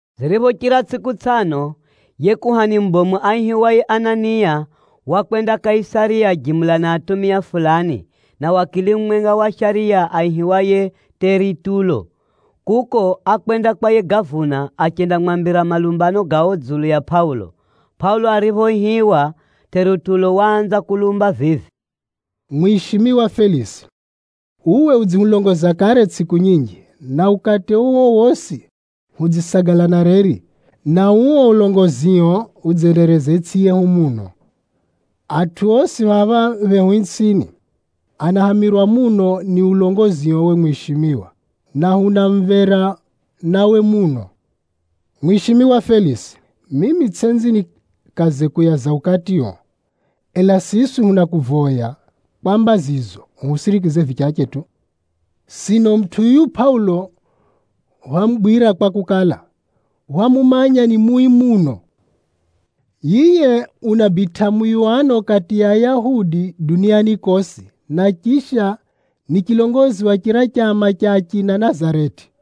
Ziriphochira tsʼiku tsʼano, yiye kuhani mubomu aihiwaye Anania wakwenda Kaisariya jimula na atumia fulani, na wakili mumwenga wa shariya aihiwaye Tʼeritulo. Kuko, ákwenda kwa yiye gavuna, achendamwambira malumbano gao dzulu ya Pʼaulo. Pʼaulo ariphoihiwa, Tʼeritulo waanza kulumba vivi, “Mwishimiwa Felisi, uwe udzihulongoza kare tsʼiku nyinji, na ukati uo wosi hudzisagala na reri, na uo ulongozio udzendereza itsʼi yehu muno. Atʼu osi phapha phehu itsʼini, anahamirwa muno ni ulongozio uwe mwishimiwa, na huna mumvera nawe muno. Mwishimiwa Felisi, mimi tsʼenzi nikaze kuyaza ukatio, ela siswi hunakuvoya kwa mbazizo uhusirikise vichache tu. Sino mutʼu yuyu Pʼaulo hwamugwira kwakukala, hwamumanya ni mui muno. Yiye unabitʼa muyuwano kati ya Ayahudi duniani kosi, na chisha ni chilongozi wa chira chama cha achina Nazareti.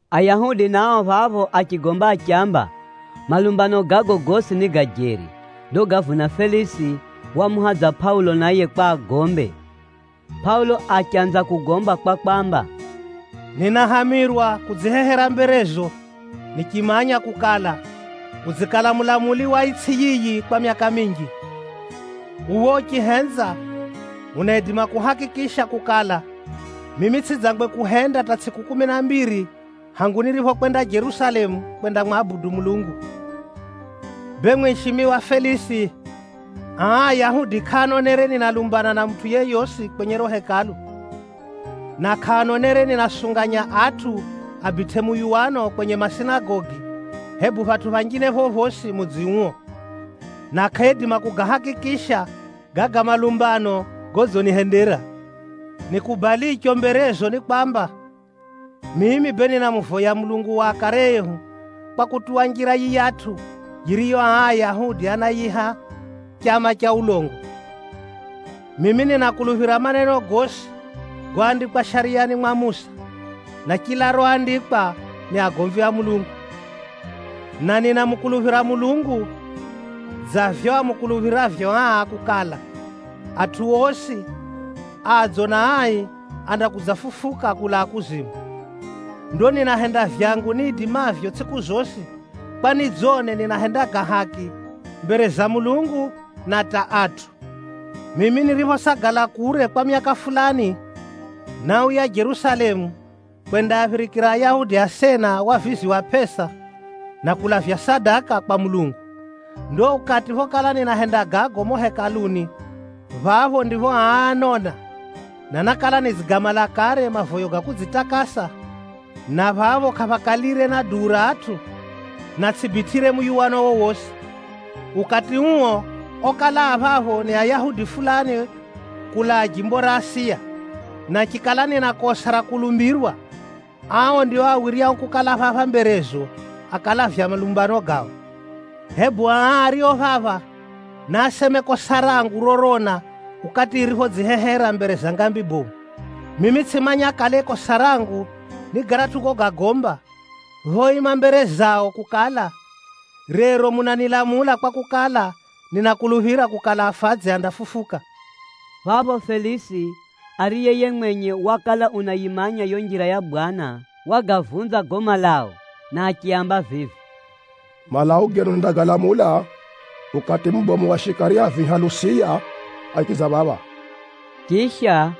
Ayahudi nao phapho achigomba achiamba, malumbano gago gosi ni ga jeri. Ndo gavuna Felisi wamuhadza Pʼaulo naye kwa agombe. Pʼaulo achanza kugomba kwa kwamba, “Ninahamirwa kudzihehera mberezo nichimanya kukala, udzikala mulamuli wa itsʼi yiyi kwa myaka minji. “Uwe uchihenza, unaidima kuhakikisha kukala, mimi tsʼidzangwe kuhenda hata tsʼiku kumi na mbiri hangu niriphokwenda Jerusalemu kwendamwabudu Mulungu. Bee mwishimiwa Felisi, aa Ayahudi kʼaanonere ninalumbana na mutʼu yeyosi kwenye riro Hekalu, na kʼaanonere ninaasunganya atʼu abitʼe muyuwano kwenye masinagogi, hebu phatʼu phanjine phophosi mudzi uo. Na kʼaaidima kugahakikisha gaga malumbano godzinihendera. Nikubalicho mberezo ni kwamba, mimi bee ninamuvoya Mulungu wa akare ehu kwa kutuwa Njira yiyatʼu yiriyo aa Ayahudi anayiiha chama cha ulongo. Mimi ninakuluphira maneno gosi goandikwa Shariyani mwa Musa, na chila roandikwa ni agomvi a Mulungu. Na ninamukuluphira Mulungu dza vivyo amukuluphiravyo aa kukala, atʼu osi adzo na ai andakudzafufuka kulaa kuzimu. Ndo ninahenda vyangu niidimavyo tsʼiku zosi kwa nidzone ninahenda ga haki mbere za Mulungu na hata atʼu. “Mimi niriphosagala kure kwa myaka fulani, náuya Jerusalemu kwendaaphirikira Ayahudi asena wavizi wa pʼesa, na kulavya sadaka kwa Mulungu. Ndo ukati phokala ninahenda gago mumo Hekaluni phapho ndipho aa ánona, na nákala nidzigamala kare mavoyo ga kudzitakasa, na phapho kʼaphakalire na duu ra atʼu, na tsʼibitʼire muyuwano wowosi. Ukati uo okala a phapho ni Ayahudi fulani kulaa jimbo ra Asiya. Na chikala nina kosa ra kulumbirwa, ao ndio awiryao kukala phapha mberezo, akalavya malumbano gao. Hebu aa ario phapha, naaseme kosa rangu rorona ukati niriphodzihehera mbere za ngambi bomu. Mimi tsʼimanya kale kosa rangu ni garatʼu gogagomba, phoima mbere zao kukala, ‘Rero munanilamula kwakukala, ninakuluphira kukala, afadzi andafufuka!’” Phapho Felisi, ariye yiye mwenye wakala unayimanya yo Njira ya Bwana, wagavunza gago malau, na achiaamba vivi, “Malau genu nindagalamula ukati mubomu wa shikari a viha Lusiya, achidza phapha.” Chisha,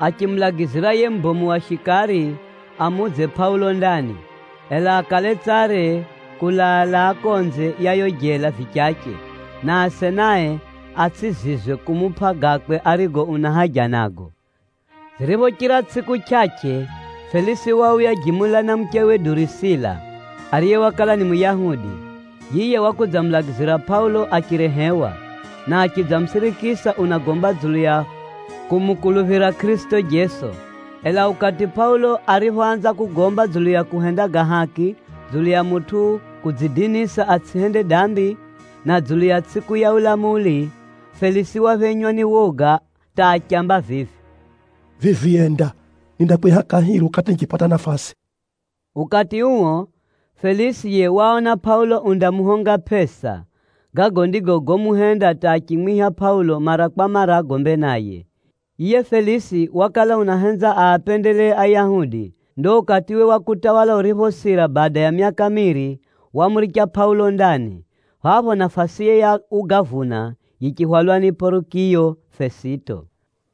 achimulagizira yiye mubomu wa shikari amuudze Pʼaulo ndani, ela akale tsare kulaa-laa konze ya yo jela vichache, na asenae atsʼizizwe kumupʼa gakwe arigo una haja nago. Ziriphochira tsʼiku chʼachʼe, Felisi wauya jimula na muchewe Durusila, ariye wakala ni Muyahudi. Yiye wakudzamulagizira Pʼaulo achirehewa, na achidzamusirikisa unagomba dzulu ya kumukuluphira Kʼirisito Jeso. Ela ukati Pʼaulo ariphoanza kugomba dzulu ya kuhenda ga haki, dzulu ya mutʼu kudzidinisa atsʼihende dambi, na dzulu ya tsʼiku ya ulamuli, Felisi waphenywa ni woga hata achiamba vivi, “Vivi enda! Nindakwiha kahiri ukati nichipata nafasi.” Ukati uo, Felisi yiye waona Pʼaulo undamuhonga pʼesa. Gago ndigo gomuhenda hata achimwiha Pʼaulo mara kwa mara agombe naye. Yiye Felisi wakala unahenza aapendelee Ayahudi. Ndo ukatiwe wa kutawala uriphosira bada ya myaka miiri, wamuricha Pʼaulo ndani. Phapho nafasiye ya ugavuna yichihwalwa ni Pʼorikiyo Fesito.